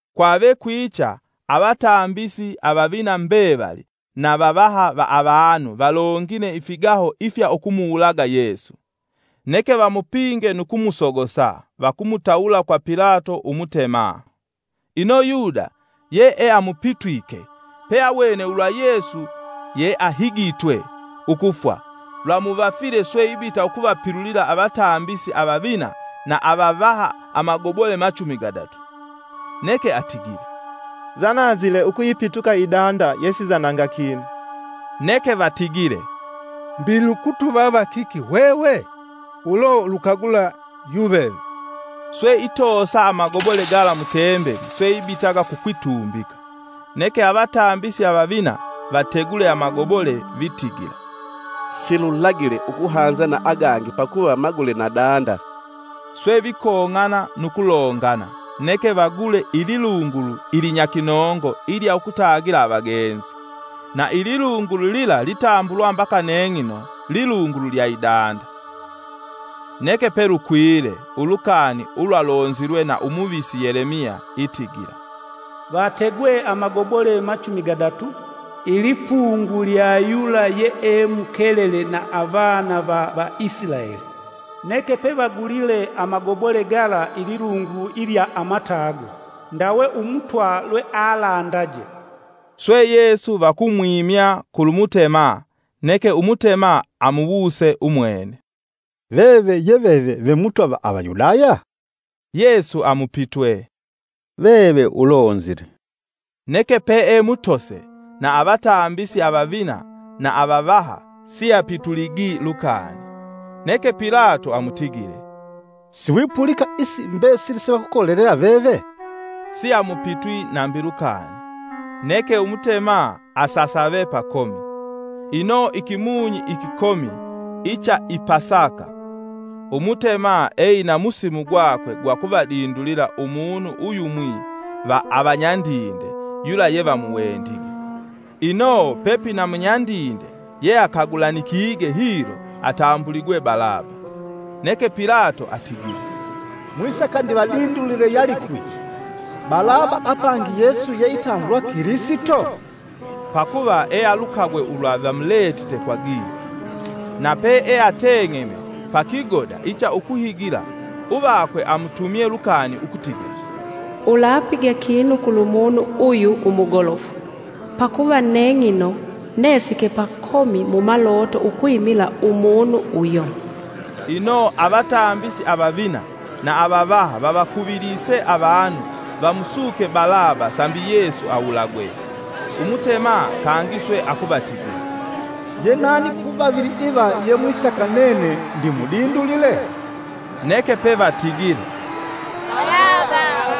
Kwave kwicha avatambisi avavina mbevali na vavaha va avanu valongine ifigaho ifya ukumuwulaga Yesu. Neke vamupinge nu kumusogosa vakumutawula kwa Pilato Umutema. Ino Yuda yeamupitwike, pe awene ulwa Yesu yeahigitwe ukufwa lwamuvafile swe ibita ukuvapilulila avatambisi avavina na avavaha amagobole machumi gadatu. Neke atigile, “Nzananzile ukuyipituka Idanda yesinzananga kinu” neke vatigile, “Mbi lukutuvava kiki hwehwe? Ulo ulukagula yuveve.” Swe itoosa amagobole gala mutembeli swe ibitaga kukwitumbika. Neke avatambisi avavina vategule amagobole itigila, “Silulagile ukuhanza na agangi pakuva magule na danda.” Swe vikong'ana nukulongana, neke vagule ililungulu ilinyakinongo ilya ukutagila avagenzi. Na ililungulu lila litambulwa mbaka neng'ino lilungulu lya idanda. Neke pelukwile ulukani ulwalonzilwe na u muvisi Yelemiya itigila, “Vategwe amagobole machumi gadatu, ilifungu lya yula yeemukelele na avana va Vaisilaeli, neke pevagulile amagobole gala ililungulu ilya amatago, ndawe Umutwa lwealandaje.” Swe Yesu vakumwimya kulumutema, neke umutema amuwuse umwene, “Veve ye veve vemutwa va Avayudaya!” Yesu amupitwe, “Veve ulonzile.” Neke peemutose na avatambisi avavina na avavaha, siapituligi lukani. Neke Pilato amutigile, “Siwipulika isi mbesili se vakukolelela veve?” Siamupitwi nambi lukani, neke Umutema asasave pakomi. Ino ikimunyi ikikomi icha i Pasaka umutema eina musimu gwakwe gwa kuvadindulila umunu uyumwi va avanyandinde yula yevamuwendige. Ino pepina munyandinde yeakagulanikige hilo atambuligwe Balaba. Neke Pilato atigile, “Mwisaka ndivadindulile yalikwi? Balaba apangi Yesu yeitambulwa Kilisito?” Pakuva ealukagwe ulwa vamuletite kwa gila. Na peeateng'eme pakigoda icha ukuhigila uvakwe amutumye lukani ukutigila, “Ulapiga kinu kulumunu uyu umugolofu, pakuva neng'ino nesike pakomi mumaloto ukwimila Umunu uyo.” Ino avatambisi avavina na avavaha vavakuvilise avanu vamusuke Balaba sambi Yesu awulagwe. Umutema kangi swe akuvatigila, “Ye nani kuvavili iva yemwisaka nene ndimudindulile?” Neke pe vatigile, “Balaba.”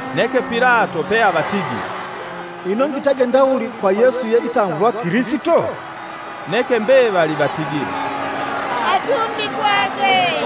Neke Pilato peavatigile, “Ino ngitage ndawuli kwa Yesu yeitambulwa Kilisito.” Neke mbevali vatigile, “Atumbikwage.”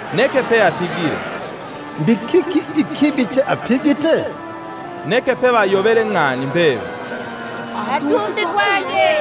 Neke peatigile, “Mbi kiki ikibi cheapigite?” Neke pevayovele ng'ani mbevali, “Atumbikwage.”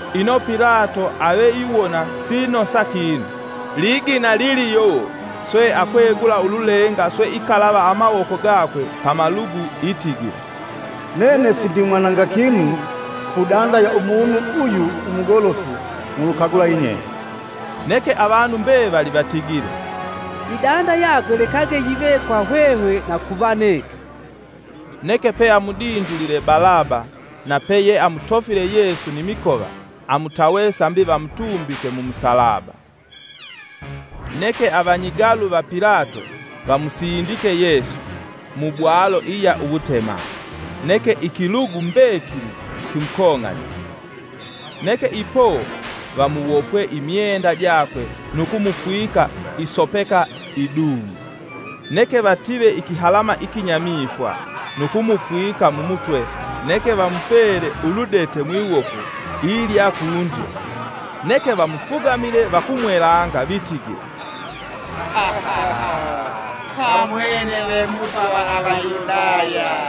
Ino Pilato aveiwona siinosa kinu, ligina liliyowo, swe akwegula ululenga swe ikalava amawoko gakwe pamalugu itigila, “Nene sindimwananga kinu ku danda ya umunu uyu umugolofu mulukagula yinyenye.” Neke avanu mbevali vatigile, “Idanda yakwe lekage yive kwa hwehwe na kuvanetu!” Neke peamudindulile Balaba na peyeamutofile Yesu ni mikova amutawe sambi vamutumbike mu musalaba. Neke avanyigalu va Pilato vamusindike Yesu mubwalo iya uwutema, neke ikilugu mbekili kimukong'anikile. Neke ipo vamuwopwe imyenda jakwe nu kumufwika isopeka idung'u, neke vative ikihalama ikinyamifwa nu kumufwika mumutwe neke vamupele uludete mwiwoko ilya kundyo. Neke vamufugamile vakumwelanga vitigila, “Kamwene ve Mutwa va Avayudaya!”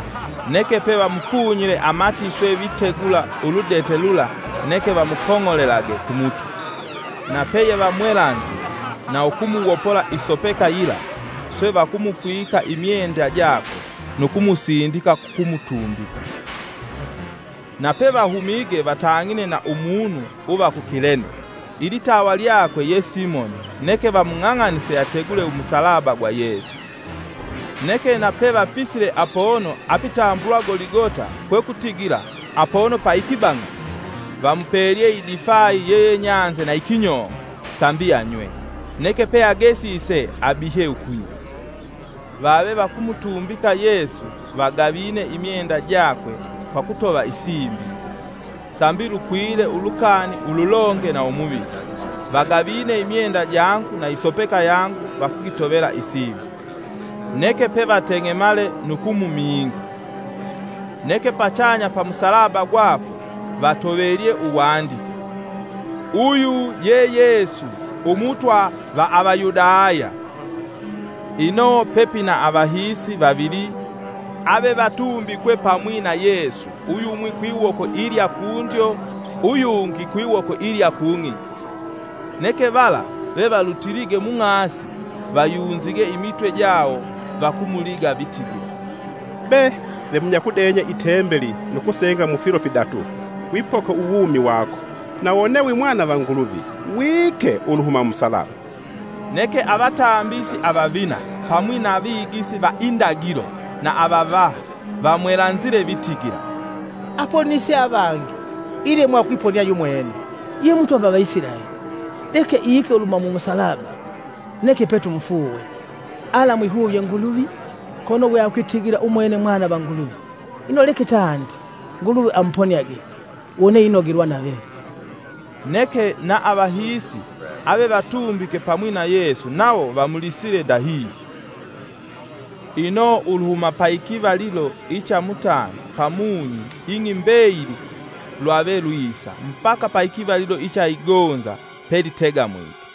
Neke pevamufunyile amati swe vitegula uludete lula neke vamukong'olelage kumutwe. Na peyevamwelanzile na ukumuwopola isopeka yila swe vakumufwika imyenda jakwe nu kumusindika kukumutumbika. Napevahumige vatang'ine na Umunu uva ku Kilene, ilitawa lyakwe ye Simoni neke vamung'ang'anise ategule umusalaba gwa Yesu. Neke na pevafisile apono apitambulwa Goligota kwekutigila, “(apono pa ikibang'a).” Vamupelye idifayi yeyenyanze na ikinyongo sambi anywe, neke peagesise abihye ukunywa. Vave vakumutumbika Yesu vagavine imyenda jakwe kwa ukutova isimbi; (sambi lukwile ulukani ululonge na umuvisi, vagavine imyenda jangu na isopeka yangu vakugitovela isimbi.) Neke pevateng'emale nu kumuminga. Neke pachanya pa musalaba gwakwe vatovelye uwandike, “UYU YE YESU UMUTWA VA AVAYUDAYA.” Ino pepina avahiisi vavili avevatumbikwe pamwi na Yesu uyumwi kwiwoko ilya kundyo uyungi kwiwoko ilya kung'igi. Neke vala vevalutilige mung'asi vayunzige imitwe jawo vakumuliga vitigila, “Be, vemunyakudenya Itembeli nu kusenga mu filo fidatu, wipoke uwumi wako, na wone wi mwana va Nguluvi, wiike uluhuma mu musalaba.” Neke avatambisi avavina, pamwi na avigisi va indagilo na avavaha, vamwelanzile vitigila, “Aponise avangi ilemwa ukwiponia yumwene. Ye mutwa va Avaisilaeli, leke iike uluhuma mu musalaba neke petumufuuwe. Alaamwihuvye Nguluvi, kono weakwitigila umwene Mwana va Nguluvi; ino leke tandi, Nguluvi amuponiage, wone inogelwa nave.” Neke na avahiisi avevatumbike pamwi na Yesu nawo vamulisile ndahihyo. Ino uluhuma paikivalilo icha mutanda pamunyi ing'i mbeyili lwavelwisa mbaka paikivalilo icha igonza pelitegamwike.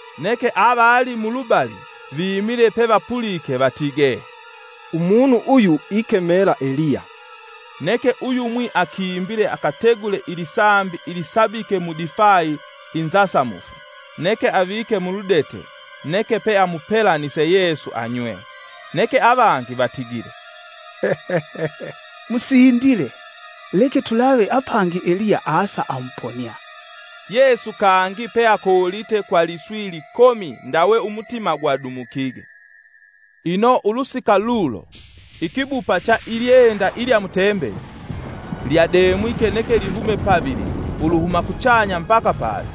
Neke avali mulubali vimile pevapulike vatigee, “Umunu uyu ikemela Eliya.” Neke uyumwi akimbile akategule ilisambi ilisabike mudifayi inzasamufu neke avike muludete neke peamupelanise Yesu anywe. Neke avangi vatigile, “Musindile, leke tulave apangi Eliya aasa amuponia.” Yesu kangi peakoolite kwa liswi likomi ndawe umutima gwadumukige. Ino ulusika lulo, ikibupa cha ilyenda ilya mutembeli ilya demwike neke lihume pavili uluhuma kuchanya mbaka pasi.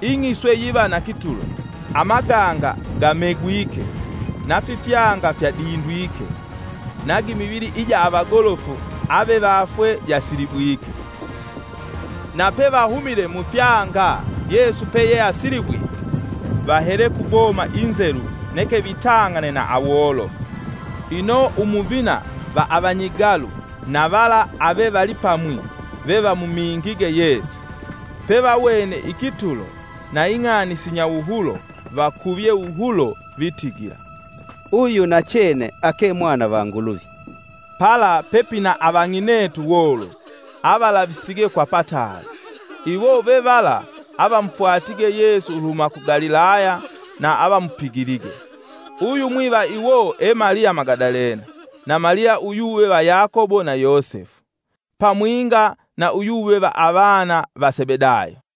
Ing'i swe yiva na kitulo, amaganga gamegwike; Nafifyanga fyadindwike, na gimivili ija avagolofu avevafwe jasilibwike. Na pevahumile mufyanga Yesu peyeasilibwike vahele kuboma inzelu neke vitang'ane na awolofu. Ino umuvina va avanyigalu na vala avevalipamwi vevamumingige Yesu, pevawene ikitulo na ing'ani sinyawuhulo vakuvye wuhulo vitigila, “Uyu nachene ake Mwana va Nguluvi.” Pala pepina avang'inetu wolofu, avalavisige kwa pataali, iwo ve vala avamufwatige Yesu uluhuma ku Galilaya na avamupigilige. Uyumwi va iwo e Maliya Magadalena, na Maliya uyuve va Yakobo na Yosefu, pamwinga na uyuva va avana va Sebedayo.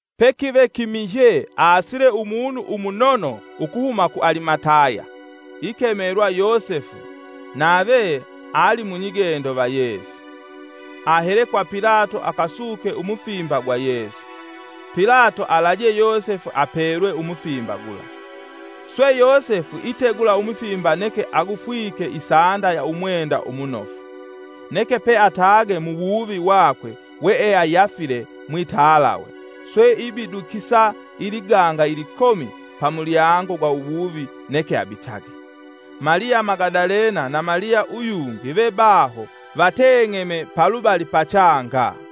Pakive kimihye aasile umunu umunono ukuhuma ku Alimataya, ikemelwa Yosefu nave ali munyigendo va Yesu. Ahele kwa Pilato akasuke umufimba gwa Yesu. Pilato alaje Yosefu apelwe umufimba gula. Swe Yosefu itegula umufimba neke agufwike isanda ya umwenda umunofu. Neke peatage muwuvi wakwe weeayafile mwitalawe, swe ibidukisa iliganga ilikomi pamulyango gwa uwuvi neke abitage. Maliya Magadalena na Maliya uyungi ve baho vateng'eme palubali pachanga.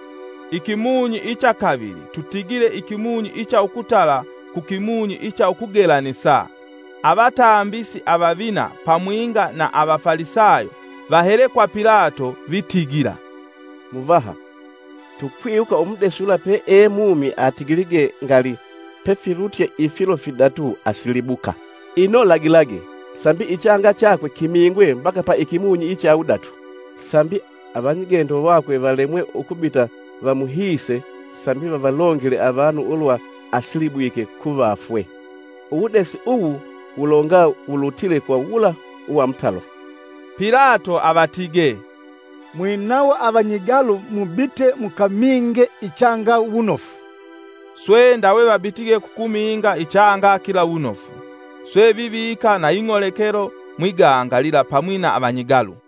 Ikimunyi icha kavili tutigile ikimunyi icha ukutala kukimunyi icha ukugelanisa, avatambisi avavina pamwinga na Avafalisayo vahele kwa Pilato, vitigila, “Muvaha tukwiwuka umudesi yula peemumi atigilige ngali: ‘Pefilutye ifilo fidatu asilibuka.’ Ino lagilage, sambi chakwe kimingwe mbaka pa ikimunyi icha wudatu, sambi apono pangi, avanyigendo vakwe valemwe ukubita vamuhiise vasindike sambi vavalongele avanu ulwa asilibwike kuvafwe. Uwudesi uwu wulonga wulutile kwa wula uwamutalo.” Pilato avatige, “Mwinawo avanyigalu mubite mukaminge ichanga wunofu. Swe ndawe vabitige kukuminga ichanga kila wunofu, swe vivika na ing'olekelo mwiganga lila pamwi na avanyigalu.”